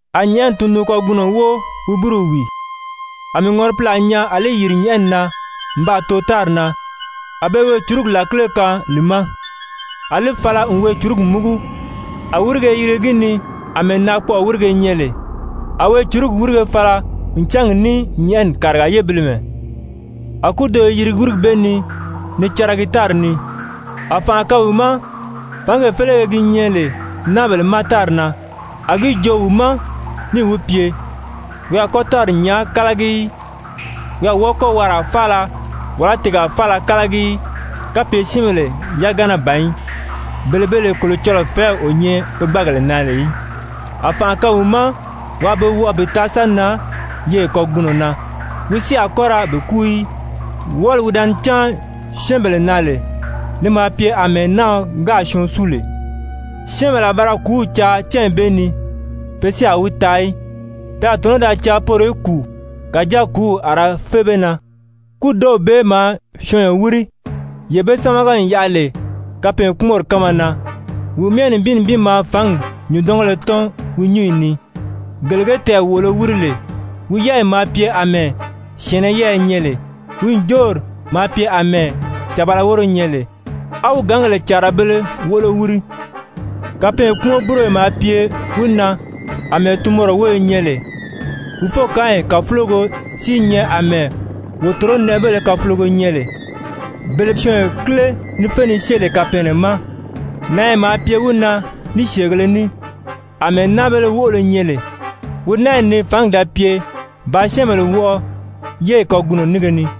A nyɛ̀ʔɛni tundun-kagunɔ wóo wi búruw wìi. A mii ŋɔripilaa nyaa a li yìri nyɛ̀ʔɛni na n baa too tári na. A be weecurugi làkile kaan li ma. A li fala n weecurugi múgu, a wírige i yirigi gi ni àmɛɛ naakpɔʔɔ wírige nyɛ lè. A weecurugi wírige fala n cángi ní nyɛ̀ʔɛni kàriga yébilimɛ. A kúdo i yirigi wírigi bee ni ni caragi tári ni, a fànʔa kaan wi ma fǎngee félege gi nyɛ lè náabèle ma tári na. A gi joo wi ma níì wi pye wi a kɔ́ tári nyàā kálagi í, wi a wɔ́ɔ kɔ́ waraa faala, wàlá tiigaa faala kálagi í, kapye syɛ́ɛnbèle yagana ban í, bele be lè Kolocɔlɔɔ fɛ̀ɛ́w o nyɛ pe gbáagèle na lè í. A fànʔa kaan wi ma waa be wɔʔɔ bi taa sa nan yeye kagunɔ na, wi si a kɔ́ ra be kúu í, wɔʔɔli wi da ni cáan syɛ́ɛnbèle na lè, li maa pye àmɛɛ náaɔ gáà syɔɔn súu lè. Syɛ́ɛnbèle a ba ra kùúw caa cányi bee ni, pe si a wi taa í. Pe a tɔ̀nɔ́ da caa poro í kùu, kàjáa kùúw a ra fé be na. Kúdow bee maa syɔɔnyɔ wíri, yee be sámaga n yaʔa lè kapɛɛnkpumɔnri kánma na. Wi myɛ nibin nibin maa fǎngi nyùndɔngéle tɔ́n wi nyúnyi ni, gele ge tɛɛ̀ wòʔolo wíri lè, wi yɛ́ɛyi maa pye àmɛɛ syɛ̀ɛnnɛ yɛ́ɛyɛ nyɛ lè. Wi ǹjoori maa pye àmɛɛ càbala wóro nyɛ lè, á wi gǎngèle càarabēle woʔolo wíri. Kapɛɛnkpumɔn-búroyo maa pye wi na àmɛɛ tunmɔrɔ wóyo nyɛ lè, wi fókaanyi kàfulogo si i nyɛ àmɛɛ wòtoronɛʔɛbéle kafulogo nyɛ lè, bele syɔɔnyɔ kíle ni fé ni syée lè kapɛɛnnɛ ma. Nanya maa pye wi na ní syèegēle ní, àmɛɛ náabéle woʔolo nyɛ lè, wi nányi ni fǎngi da pye bàā syɛ́ɛnbèle wɔʔɔ yéyi kagunɔ nínge ni.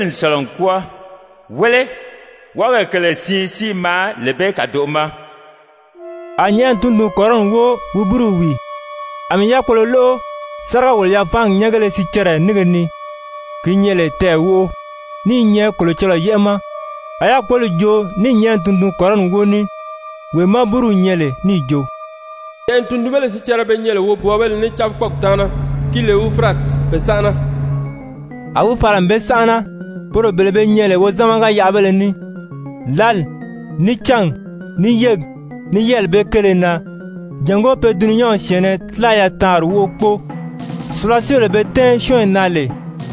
Wɔʔɔzelili n sɔ̀lɔ n kwɔ́ɔ. Wéle, wɔʔɔgèle kèle siin si i maa lee bee kàdoʔo ma. A nyɛ̀ʔɛni tundun-kɔrɔni wóo wi búruw wìi. A mii yákpolo lóʔo sáriga-wòlo-yafaangi nyɛ́ngéle sicɛrɛ nínge ni, ki nyɛ lè tɛɛ̀ wóʔo, ní i nyɛ Kolocɔlɔɔ yɛ́ʔɛ ma. A yákpoli joo ní nyɛ̀ʔɛni tundun-kɔrɔni wóo ní, wee má búruw nyɛ lè, níì jo: «Nyɛ̀ʔɛni tundunbéle sicɛrɛ be nyɛ lè wobwɔɔbéle ní cábikpɔɔgi taana ki lè Ufurati, pe sánʔana.» A wi fala n be sánʔana, poro bele be nyɛ lè wozamaga-yaʔabéle ní, lǎli, ní cángi, ní yégi, ní yɛ́ɛli bee kéele na, jàngó pe dulunyanw syɛ̀ɛnnɛ tílaya taanri wóʔo kpóo. Sùlasiibèle be tɛ̀ɛ́n syɔ́ɔnyi na lè,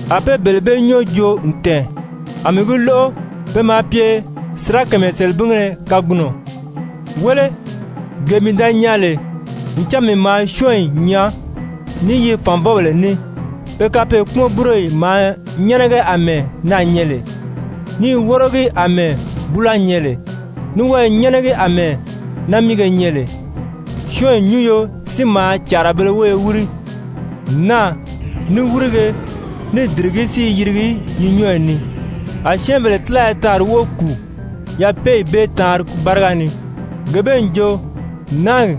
a be bele bee nyɔ́ɔ joo n tɛ̀ɛn, a mii gi lóʔo. Pe maa pye sirakamayɛ selebingéle kagunɔ. Wéle, gee mii da nyaa lè, ncan mii maa syɔ́ɔnyi nyaa ní yi fànvɔbèle ní. Pe kapɛɛnkpumɔn-búroyi maa nyɛ́nɛgɛ àmɛɛ naà nyɛ lè, ní i wórogi àmɛɛ búula nyɛ lè, ní wɔ́ɔ̀ nyɛ́nɛgɛ àmɛɛ námiige nyɛ lè. Syɔ́ɔnyi nyúnyo si maa càarabēle wóyo wíri. Naà, ní wírige, ní dìrigí si i yirigi yi nyɔ́ɔyi ni. A syɛ́ɛnbèle tílaya taanri wóʔo kùu yapeeyi bee taanri báriga ni, gee bee n jo, náagi,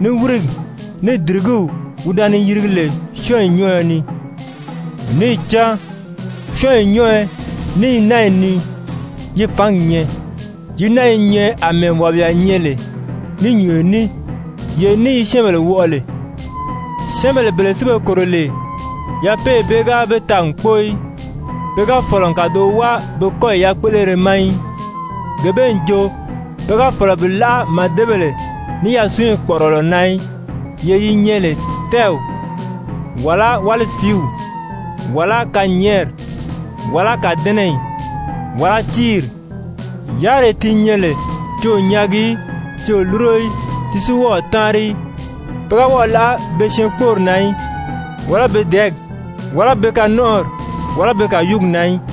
ní wírigi, ní dìrigíw wi da ni yirigi lè syɔ́ɔnyi nyɔ́ɔyɔ ni. Níì cán syɔ́ɔnyi nyɔ́ɔyɔ ní yi nányi ni yi fǎngi nyɛ. Yi nányi i nyɛ àmɛɛ wàbiya nyɛ lè ní nyùnyo ní, yee ní yi syɛ́ɛnbèle wɔʔɔ lè. Syɛ́ɛnbèle bele si be kòro lè, yapeeyi bee ga be taa n kpóo í, pe ga fɔ̀lɔ n kàdoʔo wáa be kɔ́yi yakpéʔelere ma í. Gee bee n jo pe ga fɔ̀lɔ bi láʔa màdebèle, ní yasunyi kpɔ̀ʔɔrɔlɔ na í, yee yi nyɛ lè tɛ́ɛw, wàlá wálifiiw, wàlá kanyɛɛnri, wàlá kàdɛnɛyi, wàlá tíiri, yáriree di nyɛ lè ti o nyaagi í, ti o lúro í, ti si wɔ́ɔ o táanri í. Pe ga wɔ́ɔ̀ láʔa be syɛɛnkpoori na í, wàlá be dɛ̀ɛ́gi, wàlá be kanɔnʔɔri, wàlá be kàyuugi na í.